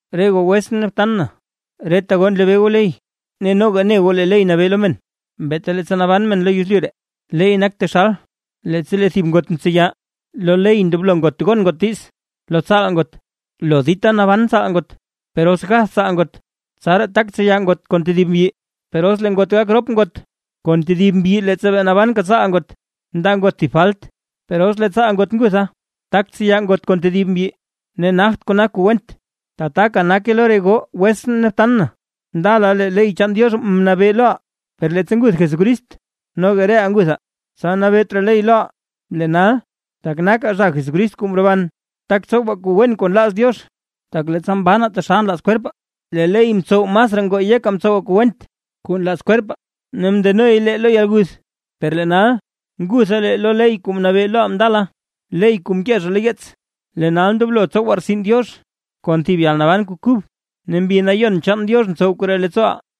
Re goo wetsʼn ne btan na, reta goo nlebee goo ley. Ne noga ne goo lee ley nabee lo men, beeta leettsa naban men lo yezlyu ree. Leey nak taxal leettsa lee thib ngot mtseya, lo ley ndoblo ngot gon ngot diiz lo tsaal ngot lo dita naban tsaal ngot. Per os gath tsaal ngot, tsaraa tak tseya ngot kon tedib mbyi. Per os lee ngot gak rop ngot kon tedib mbyi leettsa bee nabanka tsaal ngot, ndaa ngot thib falt. Per os lee tsaal ngot ngutha, tak tseya ngot kon tedib mbyi ne nagt kona kuu went. Tataka nake re goo wetsʼn ne btan na, ndala lee ley chaan Diox mnabee loʼaa; per leettsa nguth Jesucrist noga reʼaa nguthaa; tsa nabeet raa ley loʼaa. Lee nal tak nakaa zha Jesucrist kuu mroban, tak tsowaa kuu wen kuu nlaaz Diox. Tak leettsa mbanaa taxal nlaaz kwerpaa, lee ley mtsow masraa ngoo yekaa mtsowaa kuu went kuu nlaaz kwerpaa, ne mndenoy lee lo yalguth. Per lee nal, ngutha lee lo ley kuu mnabee loʼaa ndala, ley kuu mkee zha lo yeets; lee nal ndoblo tsowaa rtsin Diox, kon thib yalnaban kuu kub, ne Mbi Nayon chaan Diox ntsow koree leettsooʼaa.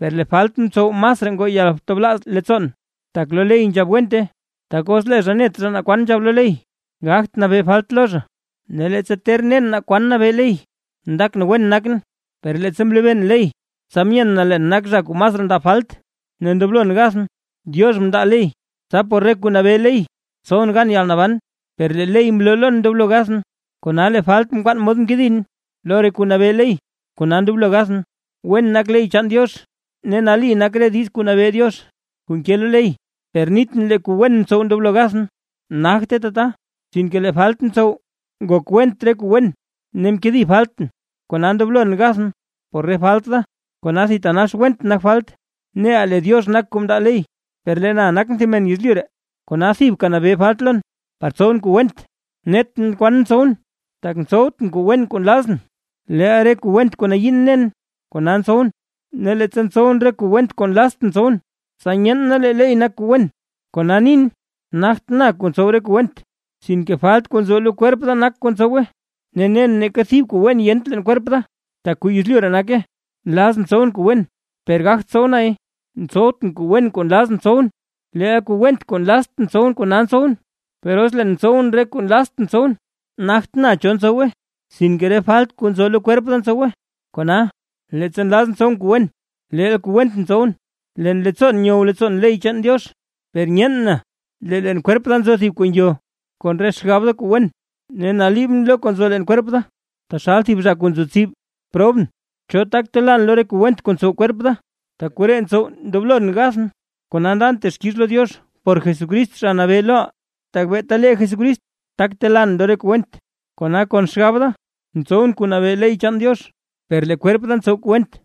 Per lee falt mtsow masraa ngoo yaltablaaz leettsoon, tak lo ley nzhab wente. Tak os lee zha net zha naa kwan nabee ley, gagt nabee falt lo zha. Ne leettsa ter nen naa kwan nabee ley, ndakʼn wen nakʼn, per leettsa mlebeen ley, tsa myeen na leen nakʼn zha kuu masraa ndab falt, ne ndoblon gathʼn. Diox mndaa ley, tsa por re kuu nabee ley tsowʼn gan yalnaban, per lee ley mloo lon ndoblo gathʼn. Kona lee falt mkwaan mod mkedin lo re kuu nabee ley, kona ndoblo gathʼn. Wen nak ley chaan Diox; ne nali nak re diiz kuu nabee Diox kuu nke lo ley. Per nitʼn lee kuu wen mtsow ndoblo gathʼn. ¡Nagte tata! Sinke lee falt mtsow ngok went re kuu wen, ne mkedi faltʼn, kona ndoblon gathʼn por re falt da. ¡Kona thitanax went nak falt! Neʼa lee Diox nak kuu mndaa ley, per lee na nakʼn thib men yezlyu ree, kona thibka nabee falt lon par tsowʼn kuu went. Netʼn kwan ntsowʼn, tak ntsowtʼn kuu wen kuu nlazʼn, leel re kuu went kuu nayiin nen, kona ntsowʼn. Ne leettsa ntsowʼn re kuu went kuu nlaztʼn tsowʼn, tsa nyeen na lee ley nak kuu wen. Kona nin nagt na kuu ntsow re kuu went, sinke falt kuu nzo lo kwerp da nak kuu ntsowe. Ne nen neeka thib kuu wen yent leen kwerp da, tak kuu lo yezlyu ree nake; nlazʼn tsowʼn kuu wen per gagt tsow nay. Ntsowtʼn kuu wen kuu nlazʼn tsowʼn, leel kuu went kuu nlaztʼn tsowʼn, kona ntsowʼn. Per os leen ntsowʼn re kuu nlaztʼn tsowʼn, nagt na cho ntsowe, sinke re falt kuu nzo lo kwerp da ntsowe. Kona, leettsa nlazʼn tsowʼn kuu wen, leel kuu went ntsowʼn. Leen leettsoon nyow leettsoon ley chaan Diox, per nyeen na, lee leen kwerp da nzo thib kuu ngyo kon re xgab da kuu wen. Ne naliibʼn lo kuu nzo leen kwerp da, taxal thib zha kuu nzo tsib. ¡Probʼn! ¿Cho tak telaan lo re kuu went kuu ntsow kwerp da? Tak koree ntsow ndoblon gathʼn. Kona ndan texkix lo Diox por Jesucrist Zha Nabee loʼaa, tak beeta lee Jesucrist tak telaan lo re kuu went; kona kon xgab da ntsowʼn kuu nabee ley chaan Diox, per lee kwerp da ntsow kuu went.